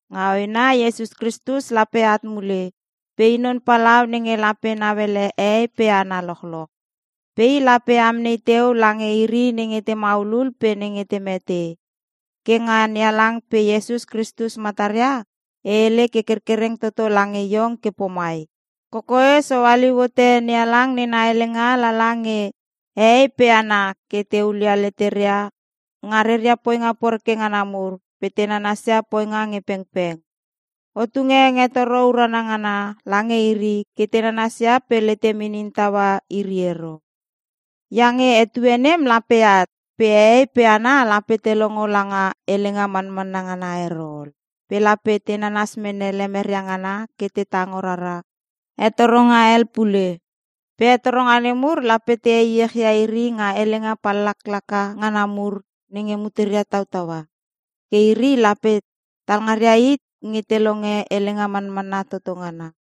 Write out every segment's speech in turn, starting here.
Nga hoena Iesus Kristus lape at mule pe i non palau nenge lape nauele hehei pe hana lochloch. Pe i lape amnei teu lange iri nenge te maulul pe nenge te mete. Ke nga NeHalang pe Iesus Kristus mataria e hele ke kerkererng toto lange iong ke pomai: Kokoes o haliu hote NeHalang nena helenga lala nge hehei pe hana ke te hulia leteria nga reria poinga poreke ngana mur pe te nanasia poinga nge pengpeng. O tunge hengetoro urana ngana lange iri ke te nanasia pe letem inin taua iri ero. Iange etue nem lape at pe hehei pe hana lape te longo langa helenga manmanna ngana ero ol. Pe lape te nanas mene lemeria ngana ke te tango rara hetoronga hel pule. Pe hetoronga nemur lape te heiechia iri nga helenga pallaklaka ngana mur nenge muteria tautaua. Ke iri lape talngaria hit nge te longe helenga manmanna toto ngana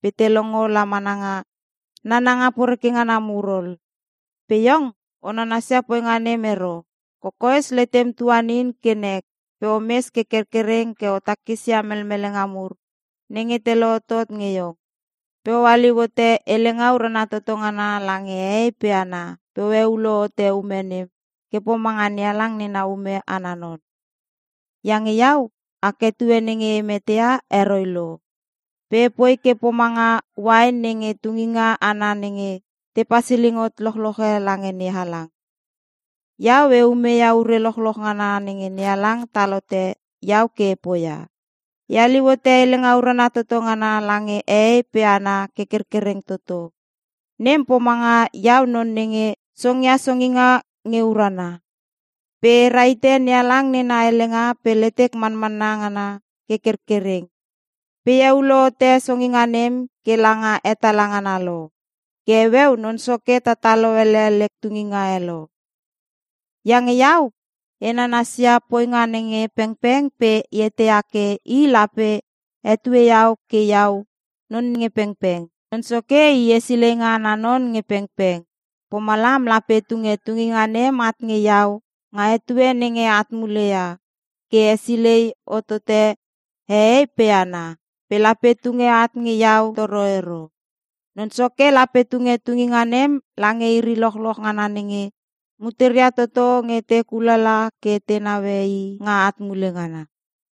pe te longo la mana nga nananga poreke ngana mur ol. Pe iong, o nanasia poinga nem ero! Kokoes letem tuanin ke nek pe omes ke kerkereng ke o takisia melmelenga mur nenge te lohotot nge iong. Pe o haliu hote Helenga Urana Toto Ngana lange hehei pe hana pe o heulo hote ume nem ke pomanga NeHalang nena ume ana non. Iange iau, ak etue nenge e meteia heroi lo. Pe epoi ke pomanga uain nenge tunginga ana nenge te pasiling hot lochloche lange NeHalang. Iau e umeia ure lochloch ngana nenge NeHalang tal hote iau ke e poia. E haliu hote helenga urana toto ngana lange hehei pe hana ke kerkereng toto. Nem pomanga iau non nenge songia songinga nge urana. Pe e rahite NeHalang nena helenga pe letek manmanna ngana ke kerkereng. Pe e heulo hote songinga nem ke langa hetala ngana lo. Ke heueu Non Soke tatalo ele lek tunginga e lo. Iange iau e nanasia poinga nge pengpeng pe e eteia ke I lape hetue iau ke iau non nge pengpeng. Non Soke i hesileinga ana non nge pengpeng. Pomalam lape tunge tunginga nem at nge iau nga etue nenge at muleia ke hesilei hotote hehei pe hana. Pe lape tunge at nge iau toro ero. Non Soke lape tunge tunginga nem lange iri lochloch ngana nenge muteria toto nge te kulala ke te naue i nga at mule ngana.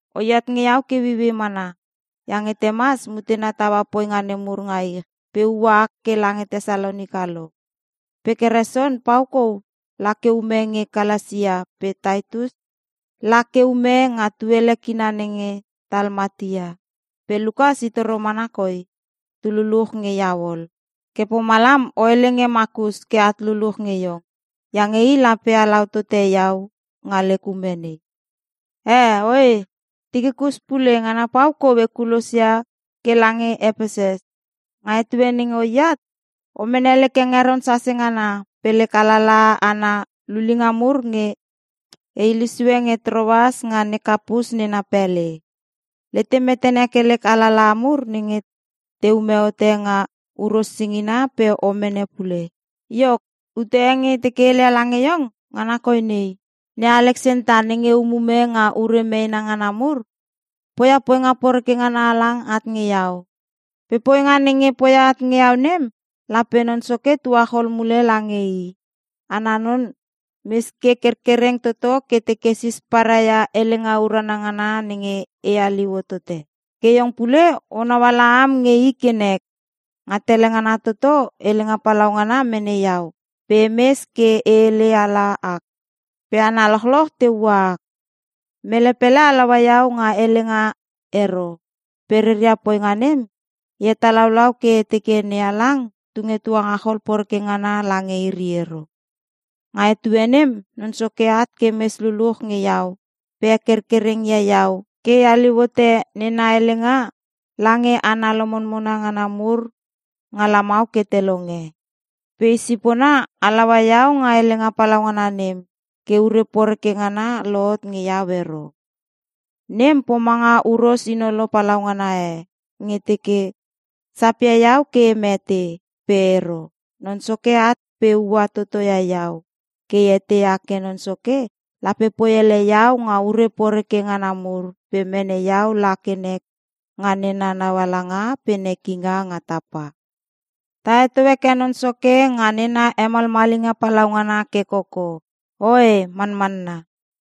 Oiat nge iau ke ueiuei mana, iange Temas mutena taua poinga nemur nga ich pe ua ak ke lange Tesalonika lo. Pe Keresen pau kou la ke ume nge Kalasia pe Titus la ke ume nga tuele kina nenge Talmatia. Pe Lukas i toro mana koi tululuch nge iau ol. Ke pomalam o hele nge Makus ke at luluch nge iong. Iange i lape halau tote iau nga lek ume nei. Eh oe, Tikikus pule ngana pau kou ekulosia ke lange Epesus. Nga etue nenge oiat, o mene lek hengeron sase ngana pe lek alalaha ana lulinga mur nge e hilesue nge Troas nga ne Kapus nena pele. Letem metene lek alalaha mur nenge teume hote nga huros singina pe o mene pule. Iok, ute e nge e teke e heleia lange iong ngana koi nei; ne Aleksanta nenge umume nga ure meena ngana mur poia poinga poreke ngana halang at nge iau. Pe poinga nenge poia at nge iau nem lape Non Soke tuachol mule lange i. Ana non mes ke kerkereng toto ke teke sisparai ia helenga urana ngana nenge e haliu hotote. Ke iong pule onau ala am nge i ke nek. Nga tele ngana toto helenga palaungana mene iau pe emes ke e hele ala ak pe hana lochloch te ua ak. Mele pele halaua iau nga helenga ero pe reria poinga nem, e hetalaulau ke e teke NeHalang tunge tuangachol poreke ngana lange iri ero. Nga etue nem Non Soke at ke mes luluch nge iau pe hekerkereng ia iau ke e haliu hote nena helenga lange hana lomonmona ngana mur nga lamau ke te longe. Pe i sipona halaua iau nga helenga palaungana nem ke ure poreke ngana lohot nge iau ero. Nem pomanga huros inolo palaungana e nge teke sapia iau ke e mete. Pe ero, Non Soke at pe ua totoia iau. Ke e eteia ke Non Soke lape poi ele iau nga ure poreke ngana mur pe mene iau la ke nek nga nena naualanga pe nekinga nga tapa. Ta heto heke Non Soke nga nena hemalmalinga palaungana ke koko. Oe, Manamanna.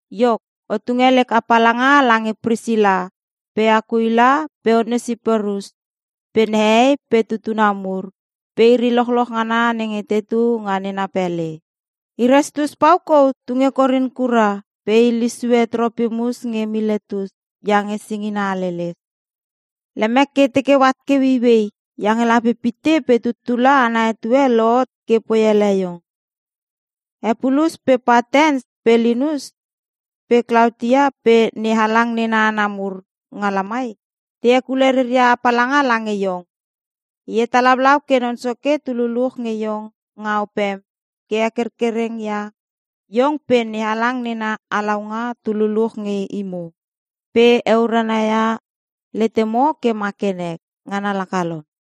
Iok, o tunge lek apalanga lange Prisila, pe Akuila, pe Onesiporus, pe nehei, pe tutuna mur, pe iri lochloch ngana nenge tetu nga nena pele. Erastus pau kou tunge Korin kura pe e hilesue Tropimus nge Miletus iange singina haleles. Lemek ke e teke oat ke ueiuei iange lape pitte pe tuttula ana etue lohot ke poi ele iong. Epulus pe Patens pe Linus pe Klaotia pe NeHalang nena hana mur nga lamai, te hekule reria apalanga lange iong. E hetalaulau ke Non Soke tululuch nge iong nga opem ke hekerkereng ia iong pe NeHalang nena halaunga tululuch nge imo pe heurana ia letemo ke ma ke nek. Ngana laka lom.